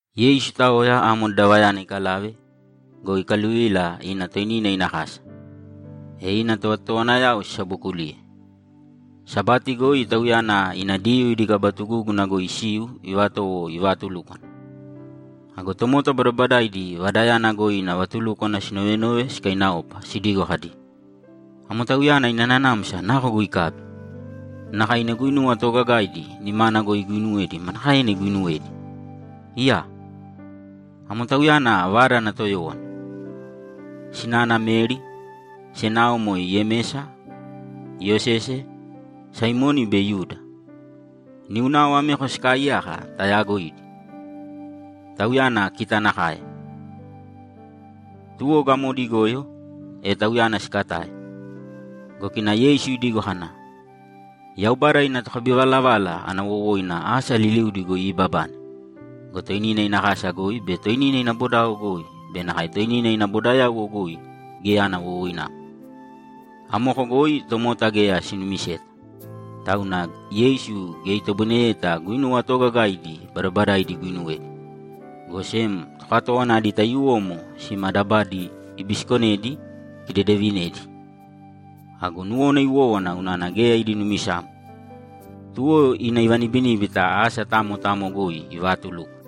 Yeisu itaoya amo dadavayana ikalave go, ikaluvila ina toinina ina kasa, e ina tovatotowanayao sisabokuliye. Sabati goi Tauyana ina Diyuu idi kaba tugúguna goi isiu ivatowo ivaatulúkwana. Ago tomota badabadaidi vadayana goi ina vatulúkwana sinovenove sikainaopa sidigo kadi, ‘Amo Tauyana ina nanamsa nako goi ikabi? Nakae ina guinuwa toogagaidi nimana goi iguuinuwedi manakaena iguinuwedi? Iyaa! Amo Tauyana vada ana toyówana! Sinana Meri, senao moe Yemesa, Iyosese, Saimoni be Yuda. Niunao ameko sikaaiyaka tayaagoidi. Tauyana kita nakae.’ Tuwo gamodi igoyo, e Tauyana sikatae. Go kina Yeisu idigo kana, ‘Yaubada ina tokabivalavala ana wowoina asa liliudi goi iibabane go, toinina ina kasa goi be toinina ina bodao goi be nakae toinina ina bodayauwo goi geya ana wowoinamo.’ Amoko goi tomota geya sinumiseta, tauna Yeisu geya itoboineyeta guinuwa toogagaidi badabadaidi iguinuwedi, go sem tokatówana adi taiyuwomo sima dabadi ibisikonedi ikidedevinedi. Ago nuwona iwówana unana geya idi numisamo. Tuwo ina ivanibiníbita asa tamo tamo goi ivaatulúkwana.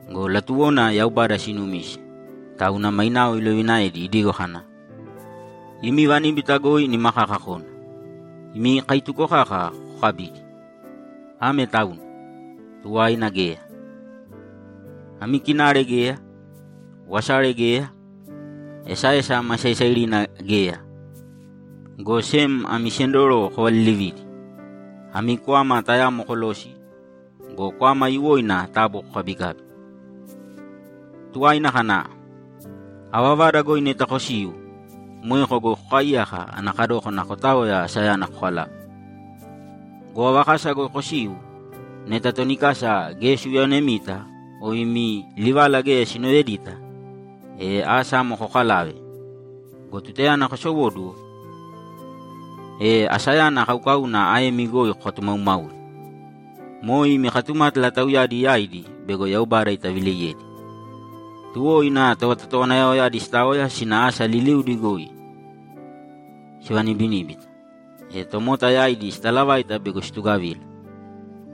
Go latuwona Yaubada sinumise, tauna mainao ilovinaedi idigo kana, ‘Imi vaníbita goi nima kaka kōna. Imi kaituko kaka kokabīdi, ame tauna; tuwaina geya. Ami kinare geya, wasare geya, esaesa ma saisairina geya, go sem ami sendoro kovalilivīdi, ami kwama tayamo kolōsi go, kwama aiyuwoina taabu kokabikābi.’ Tuwaina kana, ‘Ava vada goi neta kosiu, moeko goi kokaaiyāka ana kadókana kotaoya asayana kokalave. Go ava kasa goi kosiu, neta toni kasa geya siuyaonemita o imi livala geya sinovedita, e asa amo kokalāve go, tutayana kosowóduwo, e asayana kaukauna aemi goi kokatumaumāui. Moe imi katumátala tauyadi yaidi bego Yaubada itavileiyedi.’ Tuwo ina tovatotowanayaoyadi sitaoya sina asa liliudi goi sivanibiníbita, e tomota yaidi sitalavaita bego situgavila.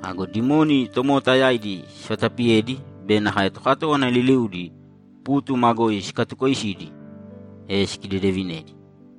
Ago dimoni tomota yaidi sivatapiyedi be nakae tokatówana liliudi pútuma goi sikatukoisidi, e sikidedevinedi.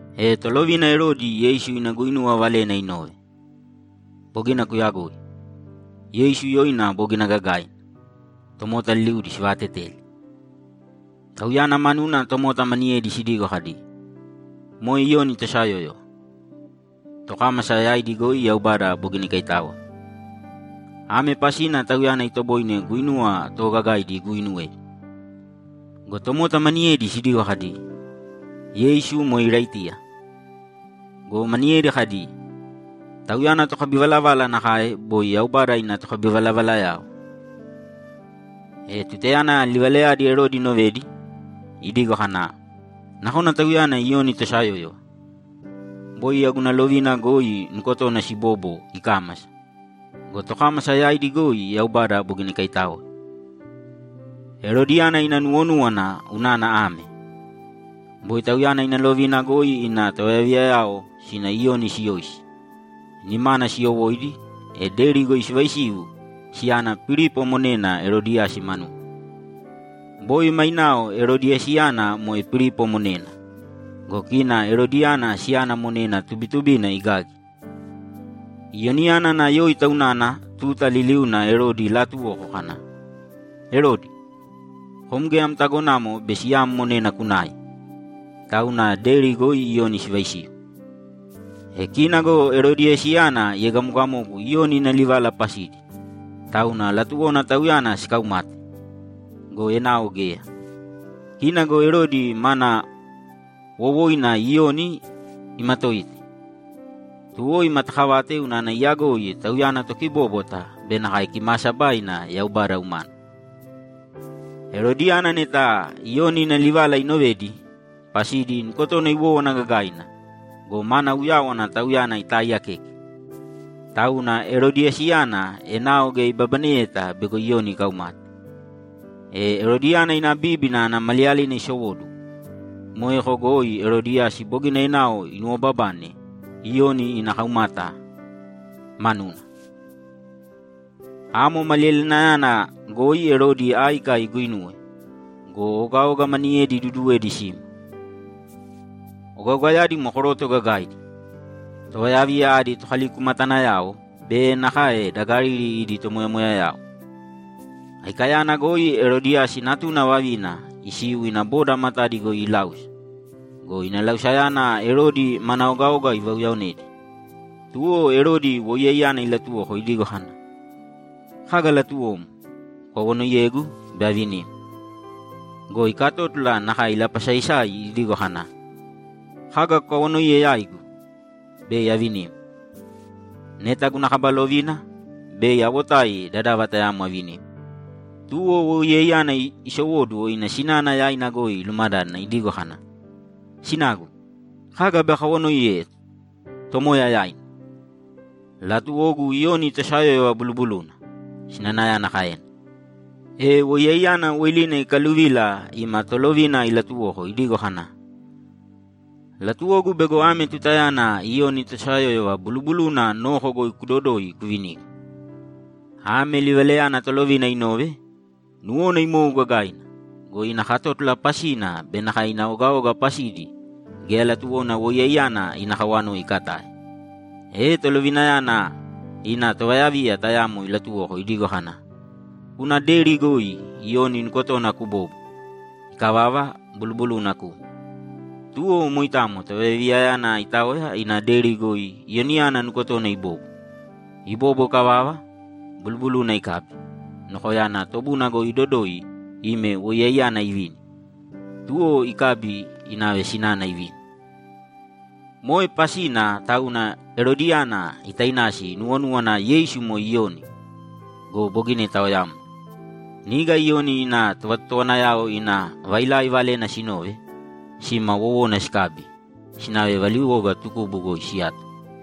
E tolovina Erodi Yeisu ina guinuwa valena inove. Bogina kuyagoi. Yeisu yoina bogina gagaina, tomota liliudi sivaateteli. Tauyana manuna tomota maniyedi sidigo kadi, ‘Moe Iyoni tosayóyova. Tokámasa yaidi goi Yaubada bogina ikaitáoe. Ame pasina Tauyana itoboine guinuwa toogagaidi iguuinuwedi.’ Go tomota maniyedi sidigo kadi, ‘Yeisu moe Iraitiya.’ Go maniyedi kadi, ‘Tauyana tokabivalavala nakae boi Yaubada ina tokabivalavalayao.’ E tutayana livalayadi Erodi inovedi, idigo kana, ‘Nakona Tauyana Iyoni tosayóyova! Boi yau guna lovina goi nukotona sibobo ikámasa go, tokámasa yaidi goi Yaubada bogina ikaitáoe.’ Erodiyana ina nuwonúwana unana ame: Boi tauyana ina lovina goi ina tovayaviyayao sina Iyoni siyoisi, nimana siyowóidi, e deri goi sivaisiu siyana Pilipo monena Erodiyasi manuna. Boi mainao Erodiyasiyana moe Pilipo monena go, kina Erodiyana siyana monena tubitubina igagi. Iyoniyana ana yóita unana tuta liliuna Erodi ilaatuwoko kana, ‘Erodi, kom geya am tagonamo bei siyam monena kunai!’ Tauna deri goi Iyoni sivaisiu. E kina go Erodiyasiyana iegamogamogu Iyoni ina livala pasidi, tauna latuwona tauyana sikaumate go, enao geya. Kina go Erodi mana wowoina Iyoni imatoite, tuwo imatakavate unana iyagoi tauyana tokibóbwata be nakae kimaasabaina Yaubada umana. Erodiyana neta Iyoni ina livala inovedi, pasidi nukotona iwówana gagaina go, mana uyáwana tauyana itaiiyakeke. Tauna Erodiyasiyana enao geya ibabaneyeta bego Iyoni ikaumate. E Erodiyana ina bíbina ana maliyalina isowóduwo. Moeko goi Erodiyasi bogina enao inuwobabane Iyoni ana kaumata manuna. Amo maliyalinayana goi Erodi áika iguinuwe go, ogaoga maniyedi iduduwedi sima. Ogaogayadi moe koroto gagaidi, tovayaviya adi tokalikumatanayao be nakae da Galili idi tomoyamoyayao. Aikayana goi Erodiyasi natuna vavina isiu ina boda matadi goi iláusa go, ina lausayana Erodi mana ogaoga ivauyaonedi. Tuwo Erodi woiyaiyana ilatuwoko idigo kana, ‘Kaga latuwom, kukawanoiyēgu, bei avinim.’ Go ikatótula nakae ilapasaisai idigo kana, ‘Kaga kukawanoiye yaigu, bei avinim. Neta guna kaba lovina, bei awotai dadava tayamo avinim.’ Tuwo woiyaiyana isowóduwo ina sinana yaina goi ilumadádana idigo kana, ‘Sinagu, kaga bei akawanoiye tomoya yaina?’ ‘Latuwogu Iyoni tosayóyova bulubuluna’, sinanayana kaena. E woiyaiyana woilina ikaluvila ima tolovina ilatuwoko idigo kana, ‘Latuwogu bego ame tutayana Iyoni tosayóyova bulubuluna noko goi kudodōi kuvinīgu.’ Ame livalayana tolovina inove, nuwona imou gagaina go, ina katótula pasina be nakae ina ogaoga pasidi geya latuwona woiyaiyana ina kawanoi ikatae. E tolovinayana ina tovayaviya tayamo ilatuwoko idigo kana, ‘Kūna deri goi Iyoni nukotona kubōbo. Ikavava, bulubuluna kūme.’ Tuwo moitamo tovayaviyayana itaoya ina deri goi Iyoniyana nukotona ibobo. Ibobo ikavava, bulubuluna ikabi, nokoyana tobuna goi idodoi ime woiyaiyana ivini. Tuwo ikabi inave sinana ivini. Moe pasina tauna Erodiyana itainasi inuwonúwana Yeisu moe Iyoni go, bogina itaoyamna. Niga Iyoni ina tovatotowanayao ina vailai valena sinove, sima wowona sikabi, sinave valiwoga tukubu goi siyato.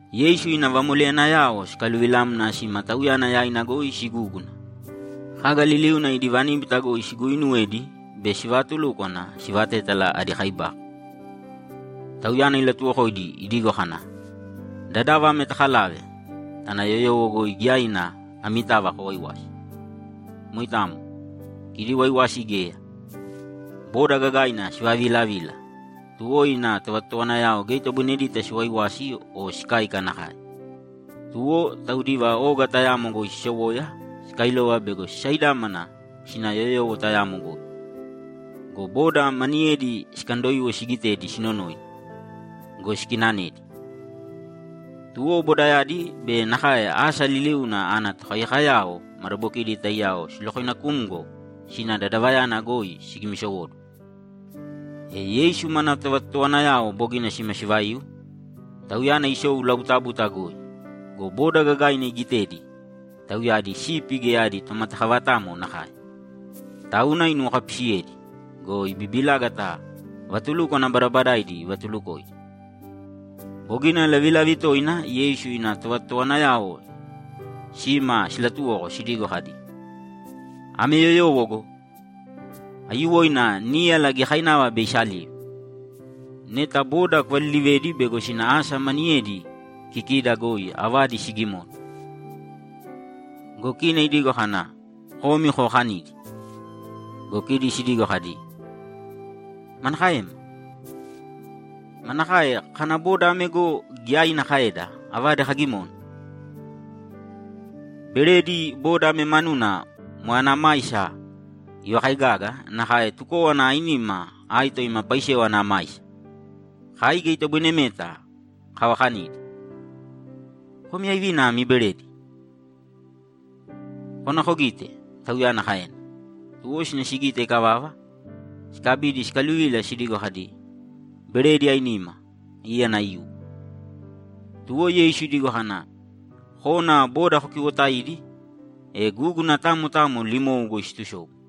Yeisu ina vamoleyanayao sikaluvilamna sima Tauyana yaina goi sigúguna go, kaga liliuna idi vaníbita goi siguuinuwedi be sivaatulúkwana sivatétala adi kaibako. Tauyana ilatuwokoidi idigo kana, ‘Dadava ame takalāve, tāna yoyowo goi giyaina amitava kowaiwāsi.’ Moitamo, kidi waiwasi geya. Boda gagaina sivaviilavila, tuwo ina tovatotowanayao geya itoboinedita siwaiwasi o sikáika nakae. Tuwo, taudiva oga tayamo goi sisowoya sikailova bego sisaidámana sina yoyowo tayamo goi. Go boda maniyedi sikandoiwo sigitedi sinonoina go, sikinanedi. Tuwo, bodayadi be nakae asa liliuna ana tokaiyakayao madabokidi taiyao silokoinakumgo sina dadavayana goi sigimisowóduwo. E Yeisu mana tovatotowanayao bogina sima sivaiu, Tauyana isou labutabuta goi go, boda gagaina igitedi tauyadi sipi geya adi tomatakavatamo nakae. Tauna inuwokapisiyedi go, ibibilágata vatulúkwana badabadaidi ivatulukoidi. Bogina lavilavi toina Yeisu ina tovatotowanayao sima silatuwoko sidigo kadi, ‘Ame yoyowo go! Aiyuwoina níyala giyakainava bei isaliu. Neta boda kuvalilivēdi bego sina asa maniyedi kikida goi avadi sigimona.’ Go kina idigo kana, ‘Komi kovakanīdi.’ Go kidi sidigo kadi, ‘Manakaema? Manakae kana boda ame go, giyaina kaeda avadi kagimona? Beredi boda ame manuna moe ana maisa ivakaigaga nakae tukówana ainima aito ima paisewa ana maisa! Kai geya itoboinemeta kavakanidi.’ ‘Komi aivina ami beredi? Kōna kogīte’, Tauyana kaena. Tuwo sina sigite ikavava, sikabidi sikaluvila sidigo kadi, ‘Beredi ainima, íyana aiyuwo.’ Tuwo Yeisu idigo kana, ‘Kōna boda kokiwotāidi, e gúguna tamo tamo limou goi situsobu.’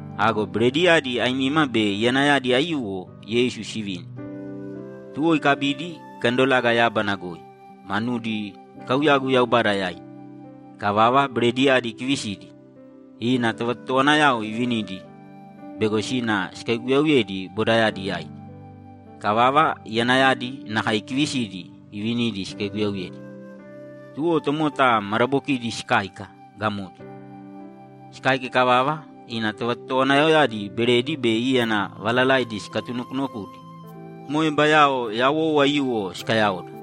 Ago berediyadi ainima be iyanayadi aiyuwo Yeisu sivini. Tuwo ikabidi, ikandolaga yábana goi, manudi ikauyagu Yaubada yaina. Ikavava, berediyadi ikivisidi, ina tovatotowanayao ivinidi bego sina sikaiguyauyedi bodayadi yaidi. Ikavava, iyanayadi nakae ikivisidi ivinidi sikaiguyauyedi. Tuwo tomota madabokidi sikáika gamodi. Sikáika ikavava, ina tovatotowanayaoyadi beredi be íyana valalaidi sikatunokunokudi go, moe bayao yawou aiyuwo sikayaoda.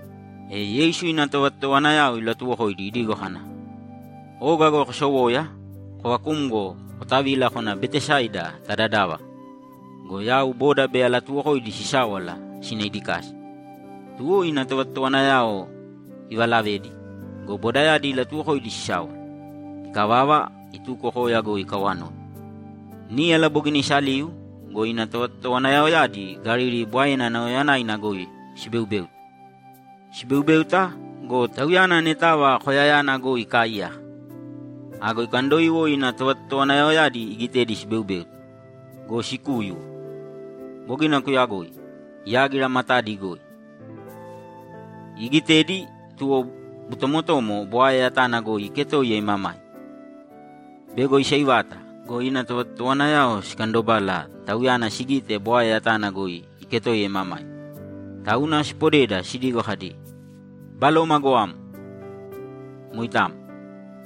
E Yeisu ina tovatotowanayao ilatuwokoidi idigo kana, ‘Oga goi kosowōya, kovakūmgo kotavīla kōna Betesaida ta dadava go, yau boda bei alatuwokoidi sisáwala sina idi kasa.’ Tuwo ina tovatotowanayao ivalavedi go, bodayadi ilatuwokoidi sisáwala. Ikavava, ituko koya goi ikawanoi. Níyala bogina isaliu go, ina tovatotowanayaoyadi Galili Bwaena nauyayanaina goi sibeubéuta. Sibeubéuta go, Tauyana anetava koyayana goi ikaaiyaka. Ago ikandoiwo ina tovatotowanayaoyadi igitedi sibeubéuta go, sikúyuwo. Bogina kuyagoi, yágira matadi goi. Iigitedi, tuwo botomotomo bwae yatana goi iketoiya imamaima. Bego isaivata go, ina tovatotowanayao sikandobala Tauyana sigite bwae yatana goi iketoiya imamaima, tauna sipodeda sidigo kadi, ‘Baloma goamo!’ Moitamo.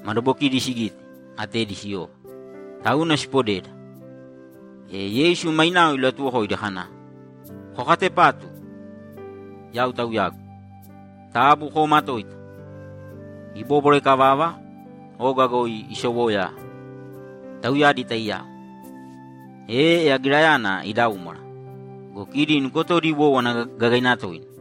Madabokidi sigite, atedi siyova, tauna sipodeda. E Yeisu mainao ilatuwokoidi kana, ‘Kokatepātu! Yau Tauyagu. Taabu koomatōita!’ Ibóbwara ikavava, oga goi isowoya tauyadi taiyao, e yagirayana idaúmwara go, kidi nukotodi iwówana gagaina toina.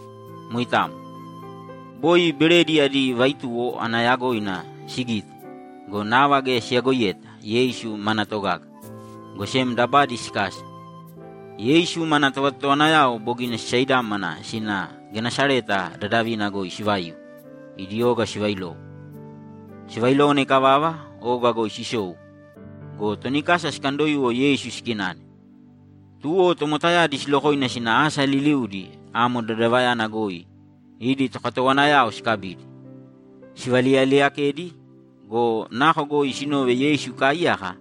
Moitamo. Boi beredi adi vaituwo ana yagoina sigite go, nava geya siyagoiyeta Yeisu mana togaga, go sem dabadi sikasa. Yeisu mana tovatotowanayao bogina sisaidámana sina Genesareta dadavina goi sivaiu, idi oga sivailowo. Sivailówana ikavava, oga goi sisou go, toni kasa sikandoiwo Yeisu sikinane. Tuwo tomotayadi silokoina sina asa liliudi amo dadavayana goi idi tokatowanayao sikabidi, sivaliyaliyakedi go, nako goi sinove Yeisu ikaaiyaka,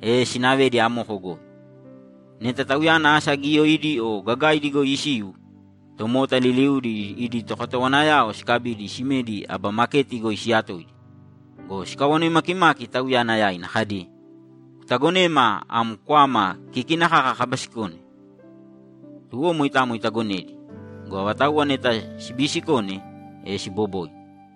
e sinavedi amoko goi. Neta Tauyana asa giyaidi o gagaidi goi isiu, tomota liliudi idi tokatowanayao sikabidi simedi aba maketi goi siyatoidi go, sikawanoi makimaki Tauyana yaina kadi, ‘Kutagonema am kwama kikina kaka kabisikone?’ Tuwo moitamo itagonedi go, avatauwa neta sibiisikone, e siboboina.